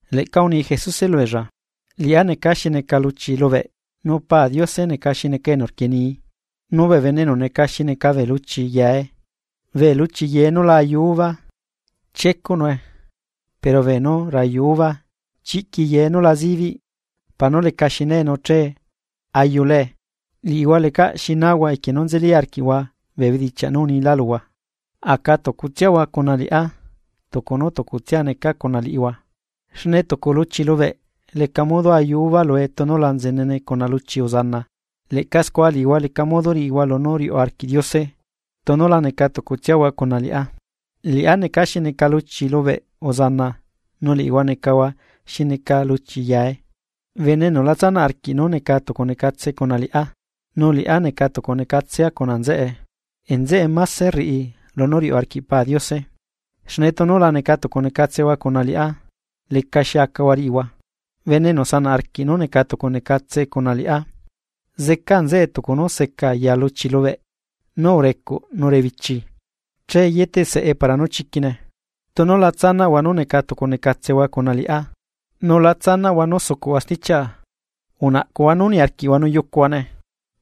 ’Leꞌca uni Jesuse lubeella: ―Liꞌá neca xi neca luchi lubeꞌ nu Pa Diose neca xi neca enu rquienii. Nu bee bene enu neca xi neca bee luchi yae. Bee luchi yae nú la ayu uva, chiecuꞌnue, pero beenú rayu uva, chiꞌqui yae nú la zibiꞌ para nú lecaxi nae nu che ayulae. Liꞌihua lecaꞌ xi nahua equie nú nzeli arquiꞌhua bee bedichiaꞌ nú unilá luhua. Aca tucutsiahua cuna liꞌá, tucu nú tucutsia necaa cuna liꞌihua, xne tucu luchi lubeꞌ leca modo ayu uva lue tunu la nzenene cuna luchi uzana leꞌca scua liꞌihua leca modo riꞌihua lunú riuꞌ arquiꞌ Diose tunu la neca tucutsiahua cuna liꞌá. ’Liꞌá neca xi neca luchi lubeꞌ uzana nu liꞌihua necahua xi neca luchi yae. Bene enu la tsanaꞌ arquiꞌ nú neca tucunecatse cuna liꞌá, nu liꞌá necatucunecatsea cuna nzeꞌe, nzeꞌe máse rriꞌi lunú riuꞌ arquiꞌ Pa Diose, xne tunu la neca tucunecatsehua cuna liꞌá lecaxi acahua riꞌihua. Bene enu sanaꞌ arquiꞌ nú neca tucunecatse cuna liꞌá, zeca nzeꞌe tucu nú seca yaa luchi lubeꞌ nú urecuꞌ nu rebichi, che yeteꞌsae para nú chiquine. ’Tunu la tsanaꞌhua nú neca tucunecatsehua cuna liꞌá nu la tsanaꞌhua nú sucuꞌhua stichiaꞌa, unaꞌcuhua nú niarquiꞌhua nu yucuhuane.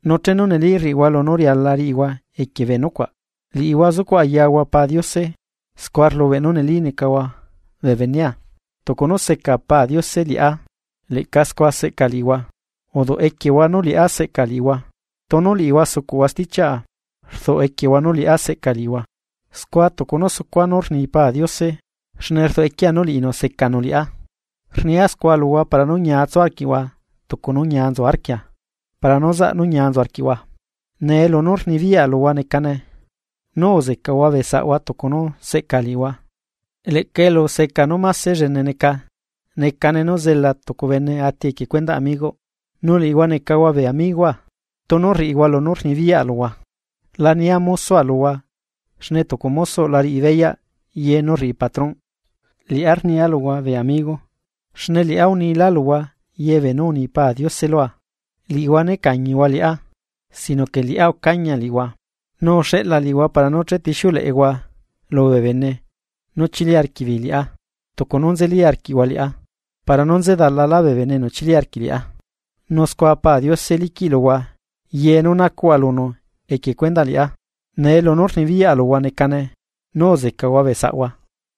Nu chenu neli rriꞌihua lunú riala riꞌihua equie bee nucuaꞌ, liꞌihua sucuꞌ ayahua Pa Diose, scua rlubeꞌ nú neli necahua bee benea. Tucu nú seca Pa Diose liꞌá, leꞌca scua seꞌca liꞌihua uduꞌ equiehua nú liꞌá seꞌca liꞌihua. Tunu liꞌihua sucuꞌhua stichiaꞌa, rduꞌ equiehua nú liꞌá seꞌca liꞌihua, scua tucu nú sucua nú rni Pa Diose, xne rduꞌ equiea nú liꞌinu secanu liꞌá. ’Rnia scua luhua para nú ñia tsu arquiꞌhua tucu nú ñia nzu arquia para nú zaꞌ nú ñia nzu arquiꞌhua. Nee lunú rnibiyaꞌa luhua necane: nú uzecahua bee saꞌhua tucu nú seꞌca liꞌihua. Leꞌca eluseca nú máse llene neca nú zela tucu bene ati equie cuendaꞌ amigoꞌ. Nu liꞌihua necahua bee amigoa, tunu rriꞌihua lunú rnibiyaꞌa luhua. La nia mosoa luhua xne tucu mosoꞌ la riꞌi beyaꞌ ye nú rriꞌi patrón. Liꞌá rnia luhua bee amigo, xne liꞌá unila luhua ye beenú uni Pa Diose lua. Liꞌihua nécañihua liꞌá, sino que liꞌá ucañia liꞌihua, nu uxeꞌla liꞌihua para nú chetixiuleꞌehua lubee bene nú chili arquiꞌbeei liꞌá, tucu nú nzeli arquiꞌhua liꞌá para nú nzedalala bee bene enu chili arquiꞌ liꞌá. Nu scua Pa Diose liquiꞌ luhua ye nú nacuꞌhua lunu equie cuendaꞌ liꞌá. Nee lunú rnibiyaꞌa luhua necane: nú uzecahua bee saꞌhua.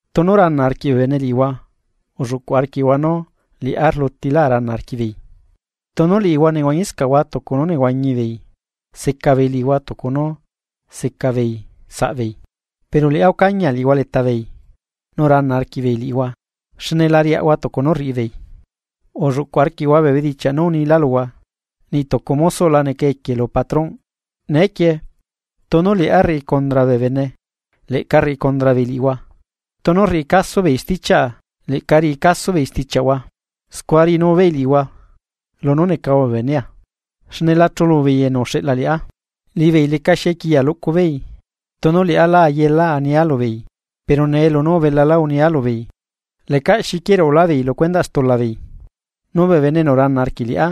’Tunu rana arquiꞌ bee bene liꞌihua ulluꞌcu arquiꞌhua nú liꞌá rlutila uhuana arquiꞌbeei. Tunu liꞌihua nehuañiscaꞌhua tucu nú nehuañi beei, seca beei liꞌihua tucu nú seca beei saꞌbeei, pero liꞌá ucañia liꞌihua leta beei, nu rana arquiꞌbeei liꞌihua, xne la riaꞌahua tucu nú rriꞌi beei. Ulluꞌcu arquiꞌhua bee bedichiaꞌ nú unilá luhua: “Niꞌ tucu mosoꞌ la neca equiela lu patronꞌ.” Neequie tunu liꞌá rriꞌi condra bee bene, leꞌca riꞌi condra beei liꞌihua, nu tunu rriꞌi caso beei stichiaꞌa, leꞌca riꞌi caso beei stichiaꞌhua. Scua riꞌinu beei liꞌihua lunú necahua bee benea, xne lachulu beei enu uxeꞌla liꞌá. ’Liꞌibeei lecaxi equiya luꞌcu beei, tunu liꞌá lá ayela ania lubeei pero nee lunú ubelalá unia lubeei lecaꞌ xi quieruꞌulá beei lu cuendaꞌ stula beei. Nu bee bene enu rana arquiꞌ liꞌá,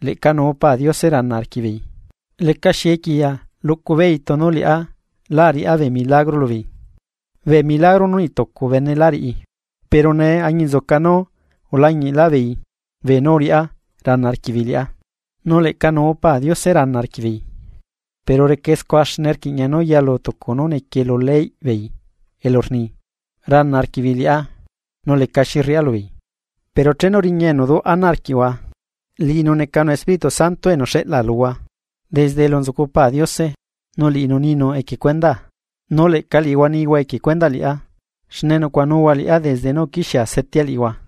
leꞌca nuu Pa Diose rana arquiꞌbeei. Lecaxi equiya luꞌcubeei tunu liꞌá lá ariꞌá bee milagro lubeei, bee milagro nú niꞌ tucu bene lá riꞌi, pero nee añinzuca nú ulañiꞌlaꞌ beei beenú uriꞌá rana arquiꞌbeei liꞌá, nu leꞌca nuu Pa Diose rana arquiꞌbeei. Pero recae scua, xne rquiꞌña nú yalu tucu nú nequie lu leyꞌ beei elu rni: “Rana arquiꞌbeei liꞌá nu lecaxi rriꞌa lubeei.” ’Pero chenu riña enu duꞌ ana arquiꞌhua, liꞌinu necanu Espíritu Santo enu xeꞌla luhua desde elu nzucu Pa Diose, nu liꞌinu ninu equie cuendaa. Nu leꞌca liꞌihua nihua equie cuendaꞌ liꞌá, xne nucuaꞌanuhua liꞌá desde nú uquixiea setea liꞌihua.